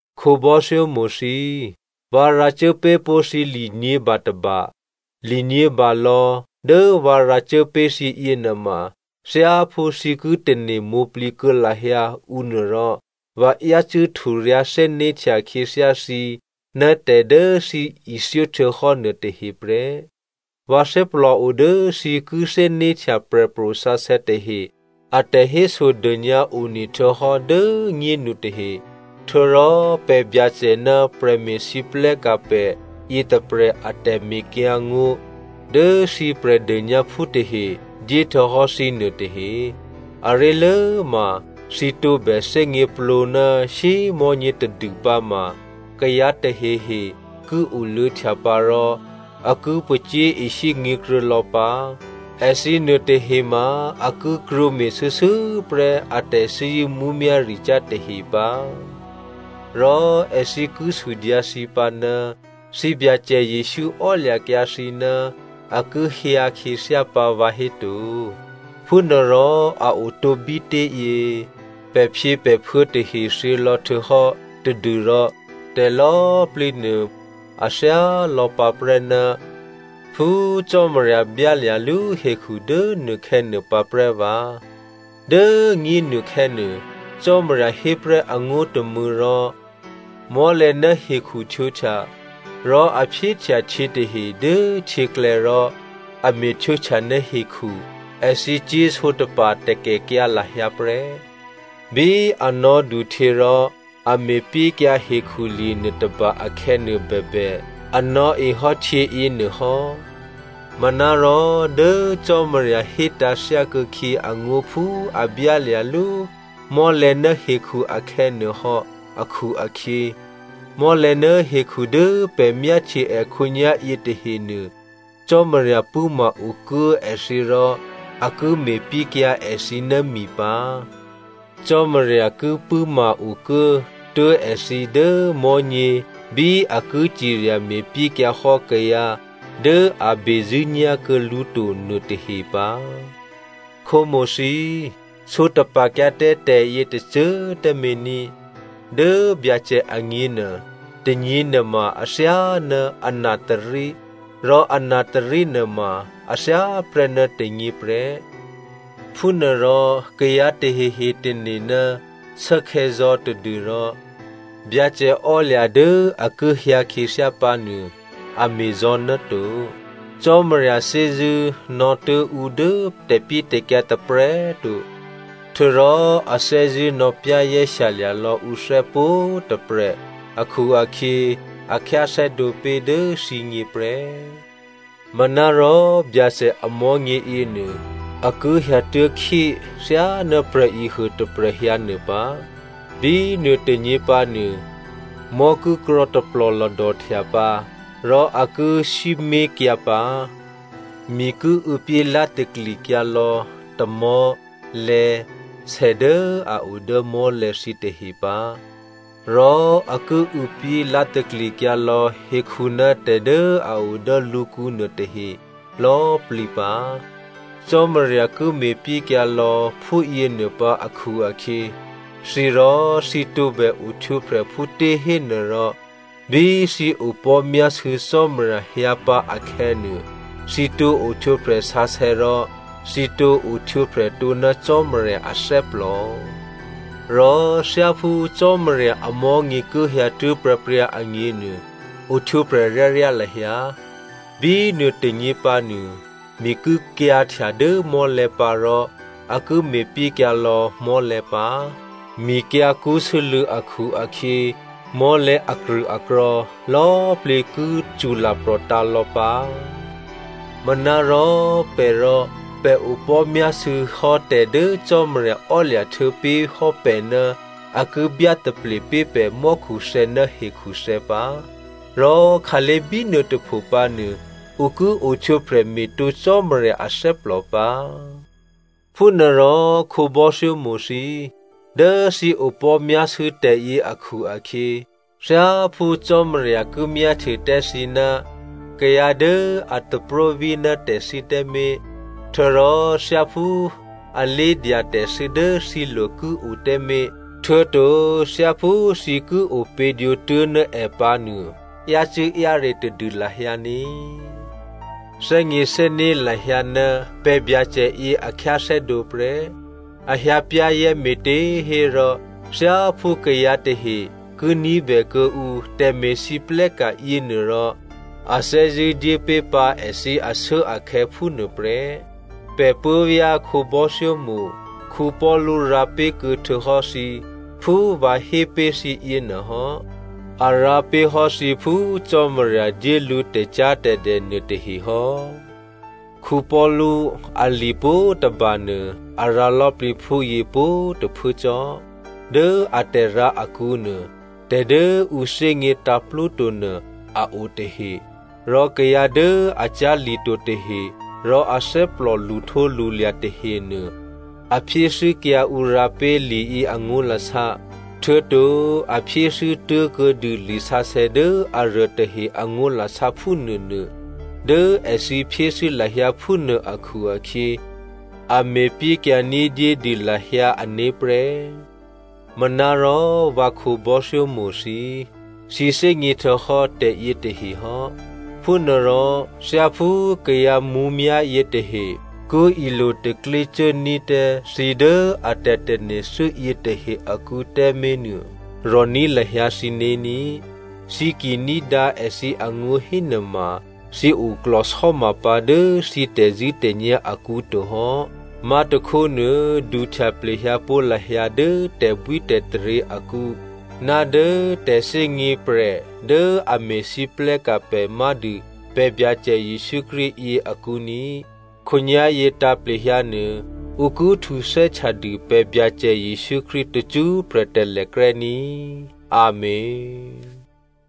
Khǒbò́thyómo̤ thǐ꤮, vǎ rǎcuố pé̤pó̤ thǐ li nyě̤ba tôba. Li nyě̤balò̌ dố vǎ rǎcuố pé̤ thǐ yěnuôma thyáphú thǐ ki tane̤ mwǒ̤plǐ kuô̌ lahyǎ ǔ nuôrò, vǎ yácû́ hturyǎ̤ thè́né̤htya khyěthyá thǐ ná tè̤ dố thǐ ithyóhtuô̌hò́ nuôtahe prè́. Vǎ thè́plòo dố thǐ ki thè́né̤htya prè̤pro̤ sǎsè̌ tahe a tè̤hésodônyǎ one htuô̌hò́ dố꤮ nyénu tahe, htuô̌rò pè̤ Byacè ná prè̤me̤lwóhteka̤ pè̤ yětôprè̤ a tè̤mekyǎngó̤ dố thǐ Prè̤dônyǎphú tahe dyé htuô̌hò́ thǐ nuôtahe. Aré̤lốma, thǐ tǒbè thè́gněplǒ ná shyémò̤́nyě tadû pǎma kayǎ tahehe ki oluô̌htya pǎ rò a ki pacyé̤ishyé nyě̤kruô̌ lò̌ pǎ. Èthǐ nuôtahe ma a ki krwǒ me̤shuô̌shuô̌prè́ a tè̤thè́zṳ̂́ mǔmyá̤ricyá̤ tahe pǎ. Rò èthǐ ki sudyǎ thǐ pǎ, “Thǐ Byacè Jesǔ ò́lya̤kyǎ thǐ ná a ki hyǎ khyěthyá pǎ vǎhéto? Phúnuôrò a otǒ bítěyě? Pè̤phyěpè̤phuô̌ tahe thyělò̌ htuô̌hò́ tadû́rò tè̤lò̌꤮ plǐ nuô, a thyálò̌ pǎprè́ ná phú Cò́marya byálya̤lú hekhu dố nuôkhè̌nuô pǎprè́ vǎ.” Dố꤮ nyénu khè̌nuô, Cò́marya hé prè́ angó̤ tômû̌ rò mò́lè̤̌ ná hekhu htwǒhtya, rò a phyéhtya htyě tahe dố htyěklè̌ rò a me̤ htwǒhtya ná hekhu, èthǐ cyé̤ sǒtapa̤ takèkyǎ lahyǎ prè́. Bí a nò̌duhtyě rò a me̤pyékyǎ hekhulye̤ nuôtôba akhè̌nuô bèbè, a nò̌e hò́ htyěyě nuôhò́. Manárò dố Cò́marya hétǎ̤ thyákuô̌khyě angó̤ phú a byálya̤lú mò́lè̤̌ ná hekhu akhè̌ nuôhò́ akhu-akhyě, mò́lè̤̌ ná hekhu dố pè̤ myáhtye è khǒnyá̤ yětahenuô, Cò́marya pṳ̂́ma okuố èthǐ rò a ki me̤pyékyǎ èthǐ ná mi pǎ. Cò́marya ki pṳ̂́ma-okuố tuố̤ èthǐ dố mò̤́nyě bí a ki cirya me̤pyékyǎ hò́ kayǎ dố a bezṳ̂́nyá̤kuô̌ lǔ to nuôtahe pǎ. Khǒmo̤ thǐ꤮, sǒtapa̤kyǎ tǎ tè̤yětôcô꤮ tǎmé̤ ní꤮. Dố Byacè agněnuô, tônyěnuôma athyáná anatôrí rò anatôrí nuôma a thyáprè́ ná tônyě prè́. Phúnuôrò kayǎ tahehe tane̤ ná shuốkhè̌zò̌ tadû́rò, Byacè ò́lya̤ dố a ki hyǎ khyěthyá pǎnuô, a me̤zò̌ ná to. Cò́marya thè́zṳ̂́ nò̌tuố̤ ǔ dố tè̤pyétè̤kyǎ tôprè̤꤮ to, htuô̌rò a thè́zṳ̂́ nò̌ za̤ lya̤ka̤ ní̤dû lò̌ ǔné̤ pwǒ̤꤮ tôprè̤ akhu-akhyě a khyáthè́dǒ pé̤ dố thǐgně prè́. Manárò Byacè amò̤́nyě yěnuô, a ki hyǎtuố̤khyé thyáná prè̤ehuô tôprè̤ hyǎnuô pǎ. Bínuô tônyě pǎnuô, mò́ ki krò̤̌ taplò̤lòdòhtya pǎ rò a ki sǐmé̤kyǎ pǎ. Mi ki û̌pyé lá̤taklikyǎ lò̌ tamò̤́, lè̌, sè dố a o dố mò́lè̤̌ thǐtahe pǎ, rò a ki û̌pyé lá̤taklikyǎ lò̌ hekhu ná tè̤ dố a o dố lǔkǔ nuôtahe lò̌꤮ plǐ pǎ. Cò́marya ki me̤pyékyǎ lò̌ phúyěnuô pǎ akhu-akhyě, thǐ rò, thǐ tǒbè ohtwǒprè̤ phútě hénuôrò, bí thǐ opò̤́ myásû̌ Cò́marya hyǎ pǎ akhè̌nuô, thǐ tǒ ohtwǒprè̤ sǎsè̌ rò, thǐ tǒ ohtwǒprè̤ tǒ ná Cò́marya athè́plò. Rò thyáphú Cò́marya amò̤́nyě ki hyǎtuố̤ pryǎpryǎ agněnuô, ohtwǒprè̤ ryáryá lahyǎ. Bínuô tônyě pǎnuô, mi ki kyǎ̤htya dố mò́lè̤̌ pǎ rò a ki me̤pyékyǎ lò̌ mò́lè̤̌ pǎ. Mikyǎ̤kṳ́ sû́lû̌ akhu-akhyě mò́lè̤̌ akrṳ̂akrò̤̌ lò̌꤮ plǐ ki cṳlaprò̤tǎ̤ lò̌ pǎ. Manárò pè̤ rò, pè̤ opò̤́myásû̌ hò́ tè̤dố Cò́marya ò́lya̤ htuô̌ pé̤hò́ pè̤ ná a ki byátaple pé̤ pè̤ mò́khuthè̌ ná hekhuthè̌ pǎ, rò khǎlé̤ bínuôtôpho pǎnuô ǔ ki ohtwǒprè̤ me̤tǒ Cò́marya athè́plò pǎ. Phúnuôrò khǒbò́thyómo̤ thǐ꤮, dố thǐ opò̤́myásû̌ tè̤yě akhu-akhyě, thyáphú Cò́marya ki myáhtye tǎ thǐ ná kayǎ dố a tapróví ná tè̤thû́ tǎmé̤, htuô̌rò thyáphú alé̤dya tè̤thû́ dố thǐlo̤ ki o tǎmé̤, htuô̌to thyáphú thǐ ki opě̤dwǒ tuố̤ ná è pǎ nuô, yácû́-yáre tadû lahyǎ ní꤮. Thè́gněthè́né̤ lahyǎ ná pè̤ Byacè yě a khyáthè́dǒ prè́, a hyǎ pyá̤zè̤́ me̤těhérò thyáphú kayǎ tahe ki ní̤bè kuô̌ǔ tè̤me̤lwóhteka̤ yěnuôrò a thè́zṳ̂́ dyépé̤pǎ èthǐ ashuốakhè̌ phúnuôprè́. Pè̤ puố̤vyá̤ khǒbò́thyómo̤ Paulu rǎ pé̤kuô̌ htuô̌hò́ thǐ phú vǎ hé pé̤ thǐ yěnuô hò́. A rǎ pé̤hò́ thǐ phú Cò́marya dyé lǔ tè̤cyá̤tè̤dè nuôtahe hò́. Paulu ali pwǒ̤tôbanuô a rǎ lò̌plǐ phúyě pwǒ̤꤮ tôphuố cò́. Dố atè̤rǎ akǔnuô, tè̤dố ǔ thè́gně tǎ̤plúto nuô a o tahe, rò kayǎ dố a cyá̤lito tahe rò athè́plò lṳhtǒlṳlya̤ tahenuô, a phyéthû́kyǎ ǔ rǎ pé̤ liyě angó̤lasá. Htuô̌to a phyéthû́ tố̤kuô̌dû lisǎsè̌ dố aruô tahe angó̤lasá phúnuônuô. Dố èthǐ phyéthû́ lahyǎ phúnuô akhu-akhyě, a me̤pyékyǎ ní̤dyédû lahyǎ ané̤ prè́. Manárò vǎ khǒbò́thyómo̤ thǐ꤮, thǐ thè́gně htuô̌hò́ tè̤yětahe hò́. Phúnuôrò thyáphú kayǎ mǔmyá̤ yětahe ki ilo taklyé cuốní̤ tǎ thǐ dố a tè̤tane̤ thû́ yětahe akǔ tǎmé̤nuô, rò̤ní̤ lahyǎ thǐné̤ ní꤮. Thǐ ki ní̤dǎ èthǐ angó̤ hénuôma, thǐ oklò̤sò́ma pǎ dố thǐ tè̤zṳ̂́tè̤nyá̤ akǔ to hò́. Má̤tôkhónuô, duhtya plehyǎpó̤ lahyǎ dố tè̤bwítè̤taryě akǔ ná dố tè̤thè́gně prè̤ dố a me̤lwóhteka̤ pè̤ má̤dû pè̤ Byacè Jesǔ Krístu yě akǔ ní꤮. Khǒnyá̤yě tǎ̤plehyǎnuô, ǔ ki htuthè́htya dû pè̤ Byacè Jesǔ Krístu tacṳ́prè̤ talèkrè́ ní꤮ Amèn.